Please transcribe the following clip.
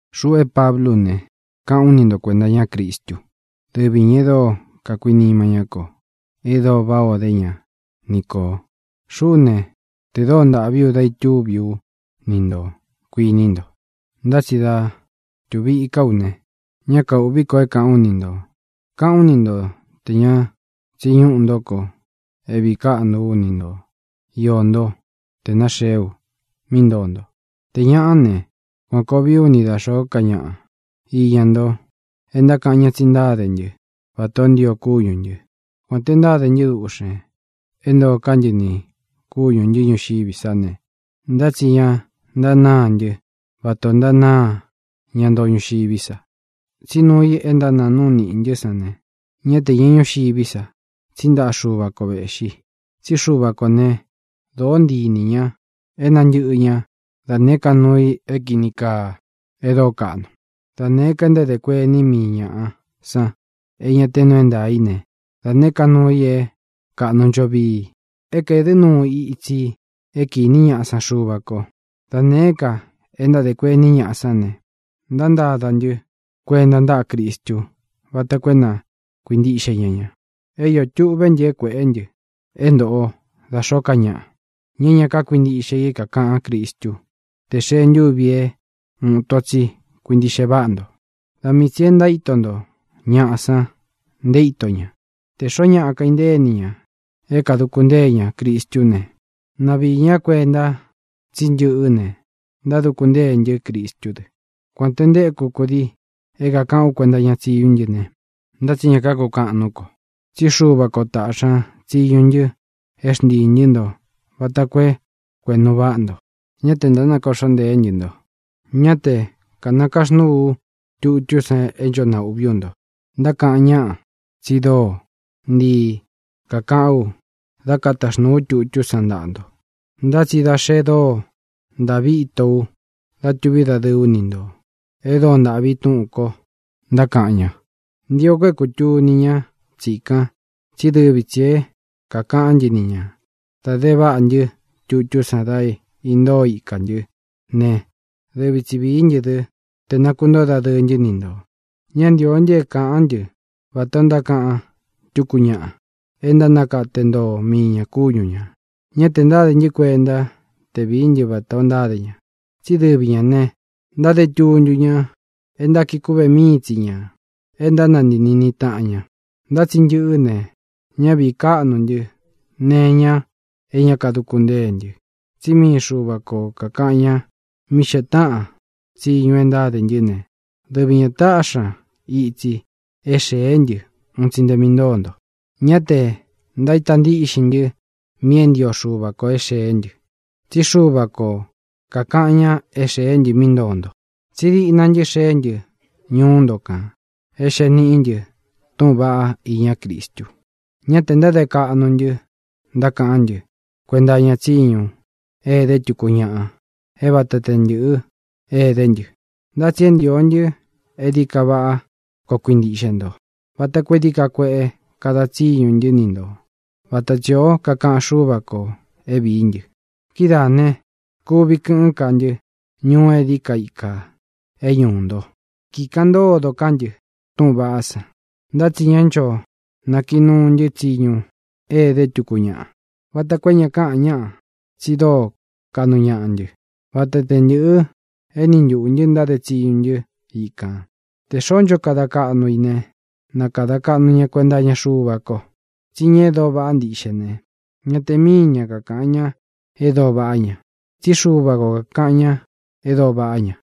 Xuꞌu é Pablu ú ne, káꞌān ú ni nto kuēnta iña Cristú, dɨvi ñā e dóo kakuinima ñá kō, e dóo váꞌā ó de ña ni kō. Xuꞌú ne, tē dóo ntāꞌví u dá itúvi ú ni ntō, kuiní nto, ntá tsi dá tuvi iká u ne, ñá kaūꞌví ko é kāꞌán u ni ntō. Káꞌān ú ni nto tē ña tsiꞌi ñúꞌū ntó ko é vīí kaꞌnu ú ni nto, iō ntó, tē náxeé u mí ntoo nto. Tē ñaꞌá ne, kuān koo vií u ni da xōó ka ñaꞌa iña nto e ntákaꞌan ña tsi ntáde ntɨ́ vatā ó ntio kúñū ntɨ. Kuān te ntáde ntɨ́ duꞌxen é ntoo ká ntɨ nī kúñū ntɨ́ ñuxiví sa ne, ntá tsi ña ntanáā ntɨ́ vatā o ntánāá ña ntoo ñuxiví sa. Tsí nuu i e ntánāa núu niꞌi ntɨ́ san ne, ñá te īñá ñuxiví sa, tsí ntaꞌa Xuva ko vēꞌxi. Tsí Xuva kō né, dōó ntii inī ña é nantɨ̄ꞌɨ ñá da nēé ka nuu i é kīni kaa, e dóo kaꞌnu. Da nēé ka e ntádē kuení mii ñāꞌa san é ña te nuu é ntaā í ne, da nēé ka nuu i é kāꞌnu ncho vii, é kaēdɨ́ nuu itsi i é kīní ñaꞌa san Xuva kō; da nēé ka e ntádē kuení ñaꞌa sán ne, ntántada ntɨ́ kuenta ntáꞌa Cristu vata koo é na kuīntiꞌxe ña ña. É iō tuꞌvé ntɨ é kuēꞌé ntɨ é ntoꞌo da xōó ka ñaꞌa, ña é ña kákuintiꞌxe i é kākaꞌán Cristu, te xee ntúvi é uun ito tsi kuintiꞌxe váꞌa nto. Da mii tsī e ntaíto nto ñaꞌa san nté ito ña. Tē xoó ñaꞌa kaintée ini ña é kāduku ntée ña Cristú ne, na viī ñá kuenta tsí ntɨꞌɨ́ ne, ntáduku ntée ntɨ́ Cristú dɨ. Kuān te ntéku kudii é kākaꞌán u kuenta iña tsiñú ntɨ ne, ntá tsi ña kakukaꞌan nuú ko, tsí Xuva kō táꞌxi ña tsiñu ntɨ é xntiī ntɨ́ nto vata koo é kuēꞌnu váꞌa nto; ñá tē ntánakōꞌxó ntēé ntɨ nto. Ñá te kataxnūu ú tutú san é ncho naūꞌví u nto. Ntákaꞌan ñáꞌa tsi dóo ntii kakaꞌán u dá kataxnūu ú tutú san ntaꞌa nto, ntá tsi da xe dóo ntāꞌví ito u dá tuví dadɨɨ ú ni ntō, e dóo ntāꞌví túꞌūn ko, ntákaꞌan ña. Ntio ko é kūtuni ñá tsīkan, tsí dɨvi tsī é kākaꞌán ntɨ ni ñā da de váꞌa ntɨ́ tutú san da intóo ikā ntɨ́ ne, dɨvi tsi vīí ntɨ dɨ te nākuntóo dadɨɨ ntɨ́ ni ntō. Ñá ntīo ntɨ é kāꞌan ntɨ́ vatā o ntákaꞌan túku ñaꞌa é ntánakate ntoo mii ñā kúñu ñā. Ñá tē ntádē ntɨ́ kuenta te vií ntɨ vatā ó ntáde ña. Tsí dɨvi ñā ne, ntáde tuntu ña é ntákiꞌi kúꞌve míi tsi ñā, é ntánantii niꞌni taꞌan ña. Ntá tsi ntɨꞌɨ́ ne, ñá vīí kaꞌnu ntɨ́ nee iña é ña káduku ntée ntɨ, tsí mii Xuva ko kākaꞌan ña mí xee táꞌan tsiñu e ntáde ntɨ́ ne, dɨvi ñā táꞌxi ña itsi é xēé ntɨ un tsi nte mí ntoo nto. Ñá tē ntaíta ntíꞌxin ntɨ́ mi é ntio Xuva ko é xēé ntɨ, tsí Xuva ko kākaꞌan ña é xēé ntɨ mí ntoo nto. Tsí diꞌna ntɨ́ xēé ntɨ ñuú nto kān é xēe níꞌi ntɨ túꞌūn vaꞌá iñá Cristu. Ñá tē ntáde kaꞌnu ntɨ ntákaꞌán ntɨ kuenta iña tsiñu é edé tuku ñáꞌa é vata te ntɨ̄ꞌɨ́ edé ntɨ. Ntá tsi é ntio ntɨ é dií ka váꞌa koo kuintiꞌxe nto, vata koo é dií ka kueꞌe kada tsiñu ntɨ́ ni ntō, vata tsī ó kakaꞌan Xúva kō é vīí ntɨ. Kidáā ne, kuvi kɨꞌɨ́n ka ntɨ́ ñuu é dií ka ikā é ñuū ntó, kikaꞌan ntódo ká ntɨ túꞌūn vaꞌá san. Ntá tsi ñá ncho nákiꞌi núu ntɨ́ tsiñu é edé tuku ñáꞌa, vata koo é ña káꞌan ñáꞌa tsi dóo kaꞌnu ñaꞌa ntɨ́, vata te ntɨ̄ꞌɨ éni ntuꞌū ntɨ ntáde tsiñu ntɨ́ ikān. Tē xoó ncho kada kaꞌnu i ne, na kadā kaꞌnu ña kuenta iña Xuva ko. Tsí ña e dóo vaꞌá ntiꞌxe ne, ña te míi ña kakāꞌan ña e dóo vaꞌá ña, tsí Xuva ko kākaꞌan ña e dóo vaꞌá ña.